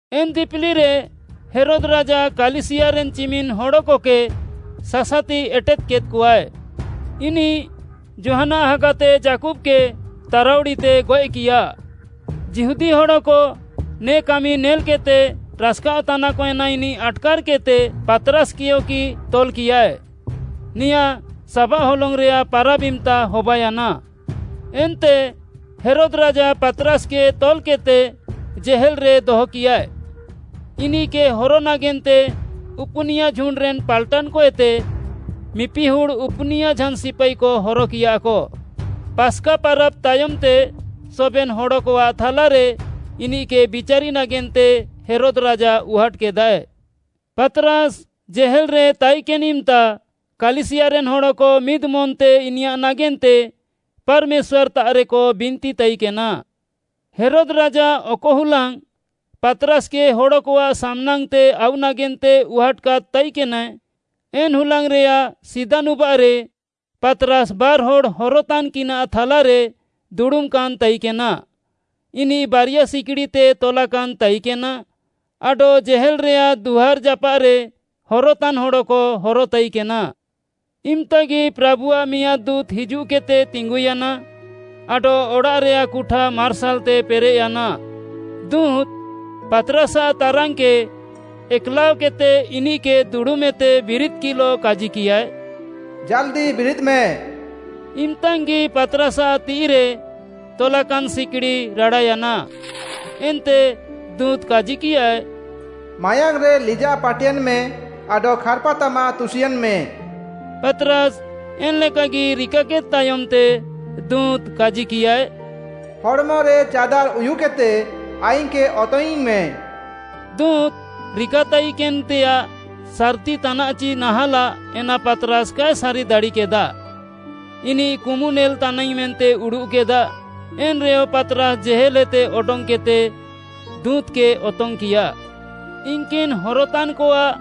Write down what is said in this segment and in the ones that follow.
ଏନ୍‌ ଦିପିଲିରେ ହେରୋଦ୍‌ ରାଜା କାଲିସିୟାରେନ୍‌ ଚିମିନ୍‍ ହଡ଼କକେ ସାସାତି ଏଟେଦ୍‌କେଦ୍‌କଆଏ। ଇନିଃ ଯୋହାନ୍‌ଆଃ ହାଗାତେ ଯାକୁବ୍‌କେ ତାରାଉଡ଼ିତେ ଗଏଃକିୟା। ଯିହୁଦୀ ହଡ଼କ ନେ କାମି ନେଲ୍‌କେଦ୍‌ତେ ରାସ୍‌କାଅଃତାନାକ ଏନା ଇନିଃ ଆଟ୍‌କାର୍‌କେଦ୍‌ତେ, ପାତ୍‌ରାସ୍‌କେୟଗି ତଲ୍‌କିୟାଏ। ନେଆଁ ସାବାଃ ହଲଙ୍ଗ୍‌ରେୟାଃ ପାରାବ୍‌ ଇମ୍‌ତା ହବାୟାନା। ଏନ୍ତେ ହେରୋଦ୍‌ ରାଜା ପାତ୍‌ରାସ୍‌କେ ତଲ୍‌କେଦ୍‌ତେ ଜେହେଲ୍‌ରେ ଦହକିୟାଏ। ଇନିଃକେ ହର ନାଗେନ୍ତେ ଉପୁନିୟା ଝୁଣ୍ଡ୍‌ରେନ୍‌ ପାଲ୍‌ଟାନ୍‌କଏତେ ମିପିହୁଡ଼୍‌ ଉପୁନିୟା ଝାନ୍‌ ସିପାଇକ ହରକିୟାକ। ପାସ୍‌କା ପାରାବ୍‌ ତାୟମ୍‌ତେ ସବେନ୍‌ ହଡ଼କଆଃ ଥାଲାରେ ଇନିଃକେ ବିଚାରି ନାଗେନ୍ତେ ହେରୋଦ୍‌ ରାଜା ଉହାଟ୍‌କେଦାଏ। ପାତ୍‌ରାସ୍‌ ଜେହେଲ୍‌ରେ ତାଇକେନ୍‌ ଇମ୍‌ତା କାଲିସିୟାରେନ୍‌ ହଡ଼କ ମିଦ୍‌ମନ୍‌ତେ ଇନିୟାଃ ନାଗେନ୍ତେ ପାର୍‌ମେଶ୍ୱାର୍‌ତାଃରେକ ବିନ୍ତିତାଇକେନା। ହେରୋଦ୍‌ ରାଜା ଅକ ହୁଲାଙ୍ଗ୍‌ ପାତ୍‌ରାସ୍‌କେ ହଡ଼କଆଃ ସାମ୍‌ନାଙ୍ଗ୍‌ତେ ଆଉ ନାଗେନ୍ତେ ଉହାଟ୍‌କାଦ୍‌ ତାଇକେନାଏ, ଏନ୍‌ ହୁଲାଙ୍ଗ୍‌ରେୟାଃ ସିଦା ନୁବାଃରେ ପାତ୍‌ରାସ୍‌ ବାର୍‌ହଡ଼୍‌ ହରତାନ୍‌କିନାଃ ଥାଲାରେ ଦୁଡ଼ୁମ୍‌କାନ୍‌ ତାଇକେନା। ଇନିଃ ବାରିୟା ସିକ୍‌ଡ଼ିତେ ତଲାକାନ୍‌ ତାଇକେନା ଆଡଃ ଜେହେଲ୍‌ରେୟାଃ ଦୁଆର୍‌ ଯାପାଃରେ ହରତାନ୍‌ ହଡ଼କ ହରତାଇକେନା। ଇମ୍‌ତାଗି ପ୍ରାଭୁଆଃ ମିଆଁଦ୍‌ ଦୁଁତ୍‌ ହିଜୁଃକେଦ୍‌ତେ ତିଙ୍ଗୁୟାନା ଆଡଃ ଅଡ଼ାଃରେୟାଃ କୁଠା ମାର୍ସାଲ୍‌ତେ ପେରେଃୟାନା। ଦୁଁତ୍‌, ପାତ୍‌ରାସ୍‌ଆଃ ତାରାନ୍‌କେ ଏକ୍‌ଲାଅକେଦ୍‌ତେ ଇନିଃକେ ଦୁଡ଼ୁମ୍‌ଏତେ ବିରିଦ୍‌କିଃଲଃ କାଜିକିୟାଏ, “ଜାଲ୍‌ଦି ବିରିଦ୍‌ମେ!” ଇମ୍‌ତାଙ୍ଗି ପାତ୍‌ରାସ୍‌ଆଃ ତିଃଇରେ ତଲାକାନ୍‌ ସିକ୍‌ଡ଼ି ରାଡ଼ାୟାନା। ଏନ୍ତେ ଦୁଁତ୍‌ କାଜିକିୟାଏ, “ମାୟାଙ୍ଗ୍‌ରେ ଲିଜାଃ ପାଟେନ୍‌ମେ, ଆଡଃ ଖାର୍‌ପାତାମାଃ ତୁସିୟେଁନ୍‌ମେ।” ପାତ୍‌ରାସ୍‌ ଏନ୍‌ଲେକାଗି ରିକାକେଦ୍‌ ତାୟମ୍‌ତେ ଦୁଁତ୍‌ କାଜିକିୟାଏ, “ହଡ଼୍‌ମରେ ଚାଦାର୍ ଉୟୁକେଦ୍‌ତେ ଆଇଙ୍ଗ୍‌କେ ଅତଙ୍ଗ୍‌ଇଁମେ।” ଦୁଁତ୍‌ ରିକାତାଇକେନ୍‌ତେୟାଃ ସାର୍‌ତିତାନାଃ ଚି ନାହାଁଲାଃ ଏନା ପାତ୍‌ରାସ୍‌ କାଏ ସାରି ଦାଡ଼ିକେଦା। ଇନିଃ କୁମୁ ନେଲ୍‌ତାନାଇଙ୍ଗ୍‌ ମେନ୍ତେ ଉଡ଼ୁଃକେଦା। ଏନ୍‌ରେୟ ପାତ୍‌ରାସ୍‌ ଜେହେଲ୍‌ହେତେ ଅଡଙ୍ଗ୍‌କେଦ୍‌ତେ ଦୁଁତ୍‌କେ ଅତଙ୍ଗ୍‌କିୟା। ଇନ୍‌କିନ୍‌ ହରତାନ୍‌କଆଃ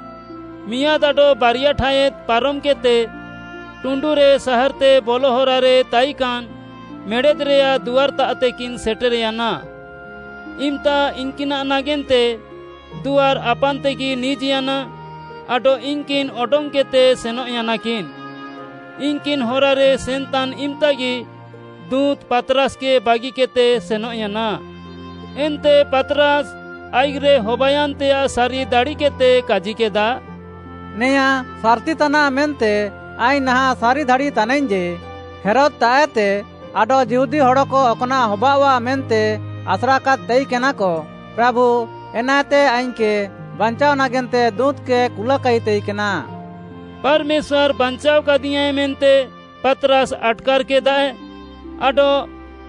ମିଆଁଦ୍‌ ଆଡଃ ବାରିୟା ଠାୟାଦ୍‌ ପାରମ୍‌କେଦ୍‌ତେ ଟୁଣ୍ଡୁରେ ସାହାର୍‌ତେ ବଲ ହରାରେ ତାଇକାନ୍‌ ମେଡ଼େଦ୍‌ରେୟାଃ ଦୁଆର୍‌ତାଃତେକିନ୍‌ ସେଟେର୍‌ୟାନା। ଇମ୍‌ତା ଇନ୍‌କିନାଃ ନାଗେନ୍ତେ ଦୁଆର୍‌ ଆପାନ୍‌ତେଗି ନିଜ୍‌ୟାନା ଆଡଃ ଇନ୍‌କିନ୍‌ ଅଡଙ୍ଗ୍‌କେଦ୍‌ତେ ସେନଃୟାନାକିନ୍‌। ଇନ୍‌କିନ୍‌ ହରାରେ ସେନ୍‌ତାନ୍‌ ଇମ୍‌ତାଗି ଦୁଁତ୍‌ ପାତ୍‌ରାସ୍‌କେ ବାଗିକେଦ୍‌ତେ ସେନଃୟାନା। ଏନ୍ତେ ପାତ୍‌ରାସ୍‌ ଆଇଃକ୍‌ରେ ହବାୟାନ୍‌ତେୟାଃ ସାରି ଦାଡ଼ିକେଦ୍‌ତେ କାଜିକେଦା, “ନେଆଁ ସାର୍‌ତିତାନାଃ ମେନ୍ତେ ଆଇଙ୍ଗ୍‌ ନାହାଁଃ ସାରି ଦାଡ଼ିତାନାଇଙ୍ଗ୍‌ ଯେ, ହେରୋଦ୍‌ତାଃଏତେ ଆଡଃ ଯିହୁଦୀ ହଡ଼କ ଅକ୍‌ନାଃ ହବାଅଃଆ ମେନ୍ତେ ଆସ୍ରାକାଦ୍‌ ତାଇକେନାକ, ପ୍ରାଭୁ ଏନାଏତେ ଆଇଙ୍ଗ୍‌କେ ବାଞ୍ଚାଅ ନାଗେନ୍ତେ ଦୁଁତ୍‌କେ କୁଲାକାଇ ତାଇକେନା।” ପାର୍‌ମେଶ୍ୱାର୍‌ ବାଞ୍ଚାଅକାଦିୟାଁଏ ମେନ୍ତେ ପାତ୍‌ରାସ୍‌ ଆଟ୍‌କାର୍‍କେଦାଏ, ଆଡଃ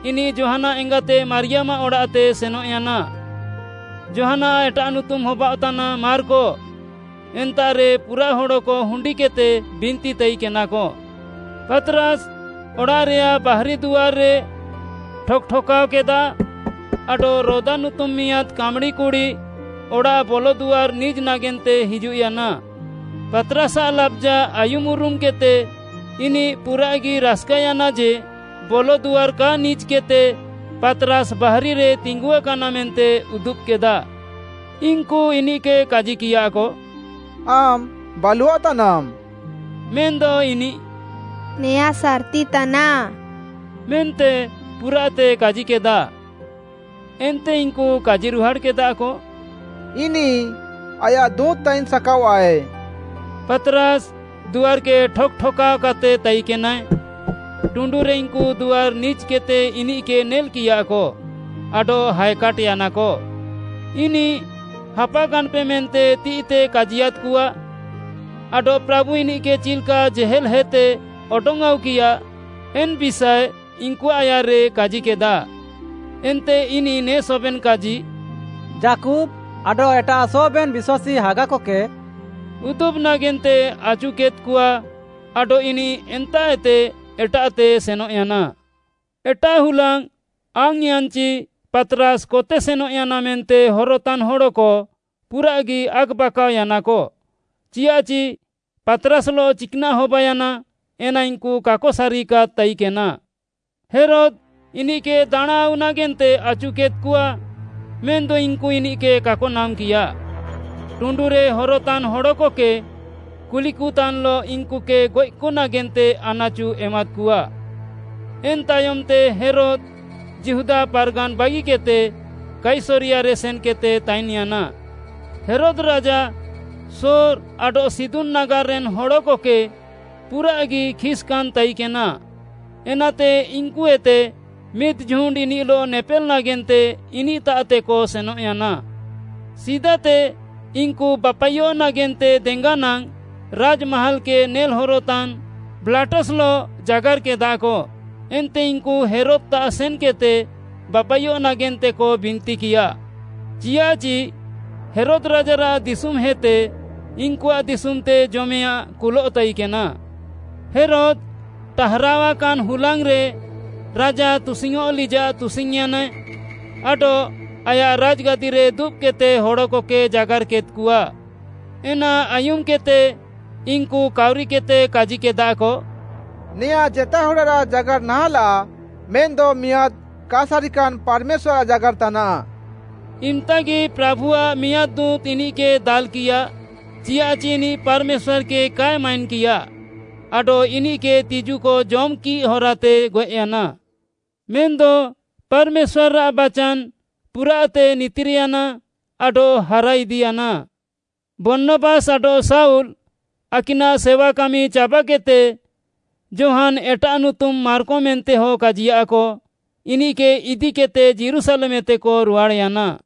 ଇନିଃ ଯୋହାନ୍‌ଆଃ ଏଙ୍ଗାତେ ମାରିୟାମ୍‌ଆଃ ଅଡ଼ାଃତେ ସେନଃୟାନା। ଯୋହାନ୍‌ଆଃ ଏଟାଃ ନୁତୁମ୍‌ ହବାଅଃତାନା ମାର୍କ। ଏନ୍ତାଃରେ ପୁରାଃ ହଡ଼କ ହୁଣ୍ଡିକେଦ୍‌ତେ ବିନ୍ତି ତାଇକେନାକ। ପାତ୍‌ରାସ୍‌ ଅଡ଼ାଃରେୟାଃ ବାହାରି ଦୁଆର୍‌ରେ ଠକ୍‌ ଠକ୍‌କାଅକେଦା ଆଡଃ ରୋଦା ନୁତୁମ୍‌ ମିଆଁଦ୍‌ କାମ୍‌ଡ଼ି କୁଡ଼ି ଅଡ଼ାଃ ବଲଦୁଆର୍‌ ନିଜ୍‌ ନାଗେନ୍ତେ ହିଜୁଃୟାନା। ପାତ୍‍ରାସ୍‍ଆଃ ଲାବ୍‌ଜା ଆୟୁମ୍‍ ଉରୁମ୍‍କେଦ୍‌ତେ ଇନିଃ ପୁରାଃଗି ରାସ୍‌କାୟାନା ଯେ, ବଲଦୁଆର୍‌ କା ନିଜ୍‌କେଦ୍‌ତେ ପାତ୍‌ରାସ୍‌ ବାହାରିରେ ତିଙ୍ଗୁଆକାନା ମେନ୍ତେ ଉଦୁବ୍‌କେଦା। ଇନ୍‌କୁ ଇନିଃକେ କାଜିକିୟାକ, “ଆମ୍‌ ବାଲୁଅଃତାନାମ୍‌।” ମେନ୍‌ଦ ଇନିଃ “ନେଆଁ ସାର୍‌ତି ତାନାଃ” ମେନ୍ତେ ପୁରାଃତେ କାଜିକେଦା। ଏନ୍ତେ ଇନ୍‌କୁ କାଜିରୁହାଡ଼୍‌କେଦାକ, “ଇନିଃ ଆୟାଃ ଦୁଁତ୍‌ ତାଇନ୍‌ସାକାଅଃଆଏ।” ପାତ୍‌ରାସ୍‌ ଦୁଆର୍‌କେ ଠକ୍‌ ଠକ୍‌କାଅକାତେ ତାଇକେନାଏ। ଟୁଣ୍ଡୁରେ ଇନ୍‌କୁ ଦୁଆର୍‌ ନିଜ୍‌କେଦ୍‌ତେ ଇନିଃକେ ନେଲ୍‌କିୟାକ ଆଡଃ ହାଏକାଟ୍‍ୟାନାକ। ଇନିଃ ହାପାକାନ୍‌ପେ ମେନ୍ତେ ତିଃଇତେ କାଜିୟାଦ୍‍କଆ ଆଡଃ ପ୍ରାଭୁ ଇନିଃକେ ଚିଲ୍‌କା ଜେହେଲ୍‌ହେତେ ଅଡଙ୍ଗ୍‌ ଆଉକିୟା, ଏନ୍‌ ବିଷାଏ ଇନ୍‌କୁଆଃ ଆୟାର୍‌ରେ କାଜିକେଦା। ଏନ୍ତେ ଇନିଃ ନେ ସବେନ୍‌ କାଜି “ଯାକୁବ୍‌ ଆଡଃ ଏଟାଃ ସବେନ୍‌ ବିଶ୍ୱାସୀ ହାଗାକକେ” ଉଦୁବ୍‌ ନାଗେନ୍ତେ ଆଚୁକେଦ୍‌କଆ ଆଡଃ ଇନିଃ ଏନ୍ତାଃଏତେ ଏଟାଃତେ ସେନଃୟାନା। ଏଟାଃ ହୁଲାଙ୍ଗ୍‌ ଆଙ୍ଗ୍‌ୟାନ୍‌ଚି ପାତ୍‌ରାସ୍‌ କତେ ସେନଃୟାନା ମେନ୍ତେ ହରତାନ୍‌ ହଡ଼କ ପୁରାଃଗି ଆକ୍‌ବାକାଅୟାନାକ। ଚିଆଃଚି ପାତ୍‌ରାସ୍‌ଲଃ ଚିକ୍‌ନାଃ ହବାୟାନା ଏନା ଇନ୍‌କୁ କାକ ସାରିକାଦ୍‌ ତାଇକେନା। ହେରୋଦ୍ ଇନିଃକେ ଦାଣାଁଆଉ ନାଗେନ୍ତେ ଆଚୁକେଦ୍‌କଆ ମେନ୍‌ଦ ଇନ୍‌କୁ ଇନିଃକେ କାକ ନାମ୍‌କିୟା। ଟୁଣ୍ଡୁରେ ହରତାନ୍‌ ହଡ଼କକେ କୁଲିକତାନ୍‌ଲଃ ଇନ୍‌କୁକେ ଗଏଃକ ନାଗେନ୍ତେ ଆନାଚୁ ଏମାଦ୍‌କଆ। ଏନ୍‌ ତାୟମ୍‌ତେ ହେରୋଦ୍‌ ଯିହୁଦା ପାର୍‌ଗାନ୍‌ ବାଗିକେଦ୍‌ତେ କାଇସରିୟାରେ ସେନ୍‌କେଦ୍‌ତେ ତାଇନ୍‌ୟାନା। ହେରୋଦ୍ ରାଜା ସୋର୍‌ ଆଡଃ ସିଦୋନ୍‌ ନାଗାର୍‌ରେନ୍‌ ହଡ଼କକେ ପୁରାଃଗି ଖିସ୍‌କାନ୍‌ ତାଇକେନା, ଏନାତେ ଇନ୍‌କୁଏତେ ମିଦ୍‌ ଝୁଣ୍ଡ୍‌ ଇନିଃଲଃ ନେପେଲ୍‌ ନାଗେନ୍ତେ ଇନିଃତାଃତେକ ସେନଃୟାନା। ସିଦାତେ ଇନ୍‌କୁ ବାପାଇୟଃ ନାଗେନ୍ତେ ଦେଙ୍ଗା ନାଙ୍ଗ୍‌ ରାଜ୍‌ମାହାଲ୍‌କେ ନେଲ୍‌ହରତାନ୍‌ ବ୍ଲାଷ୍ଟସ୍‌ଲଃ ଜାଗାର୍‌କେଦାକ। ଏନ୍ତେ ଇନ୍‌କୁ ହେରୋଦ୍‌ତାଃ ସେନ୍‌କେଦ୍‌ତେ ବାପାଇୟଃ ନାଗେନ୍ତେକ ବିନ୍ତିକିୟା, ଚିୟାଃଚି ହେରୋଦ୍‌ ରାଜାରାଃ ଦିଶୁମ୍‌ହେତେ ଇନ୍‌କୁଆଃ ଦିଶୁମ୍‌ତେ ଜମେୟାଁ କୁଲଃ ତାଇକେନା। ହେରୋଦ୍‌ ଟାହାରାୱାକାନ୍‌ ହୁଲାଙ୍ଗ୍‌ରେ ରାଜା ତୁସିଙ୍ଗ୍‌ଅଁଃ ଲିଜାଃ ତୁସିଙ୍ଗ୍‌ୟାନାଏ ଆଡଃ ଆୟାଃ ରାଜ୍‌ଗାଦିରେ ଦୁବ୍‌କେଦ୍‌ତେ ହଡ଼କକେ ଜାଗାର୍‌କେଦ୍‌କଆ। ଏନା ଆୟୁମ୍‌କେଦ୍‌ତେ ଇନ୍‌କୁ କାଉରିକେଦ୍‌ତେ କାଜିକେଦାକ, “ନେଆଁ ଜେତା ହଡ଼ରାଃ ଜାଗାର୍‌ ନାହାଁଲାଃ ମେନ୍‌ଦ ମିଆଁଦ୍‌ କା ସାରିକାନ୍‌ ପାର୍‌ମେଶ୍ୱାର୍‌ଆଃ ଜାଗାର୍‌ତାନାଃ।” ଇମ୍‌ତାଙ୍ଗି ପ୍ରାଭୁଆଃ ମିଆଁଦ୍‌ ଦୁଁତ୍‌ ଇନିଃକେ ଦାଲ୍‍କିଆ, ଚିଆଃଚି ଇନିଃ ପାର୍‌ମେଶ୍ୱାର୍‌କେ କାଏ ମାଇନ୍‍କିଆ, ଆଡଃ ଇନିଃକେ ତିଜୁକ ଜମ୍‌କିଃ ହରାତେ ଗଏଃୟାନା। ମେନ୍‌ଦ ପାର୍‌ମେଶ୍ୱାର୍‌ଆଃ ବାଚାନ୍‌ ପୁରାଃତେ ନିତିର୍‌ୟାନା ଆଡଃ ହାରାଇଦିୟାନା। ବର୍ଣ୍ଣବାସ୍‌ ଆଡଃ ଶାଉଲ୍‌ ଆକିନାଃ ସେୱାକାମି ଚାବାକେଦ୍‌ତେ ଯୋହାନ୍‌ ଏଟାଃ ନୁତୁମ୍‌ ମାର୍କ ମେନ୍ତେହ କାଜିୟାଃକ, ଇନିଃକେ ଇଦିକେଦ୍‌ତେ ଯୀରୁଶାଲେମ୍‌ଏତେକ ରୁହାଡ଼୍‌ୟାନା।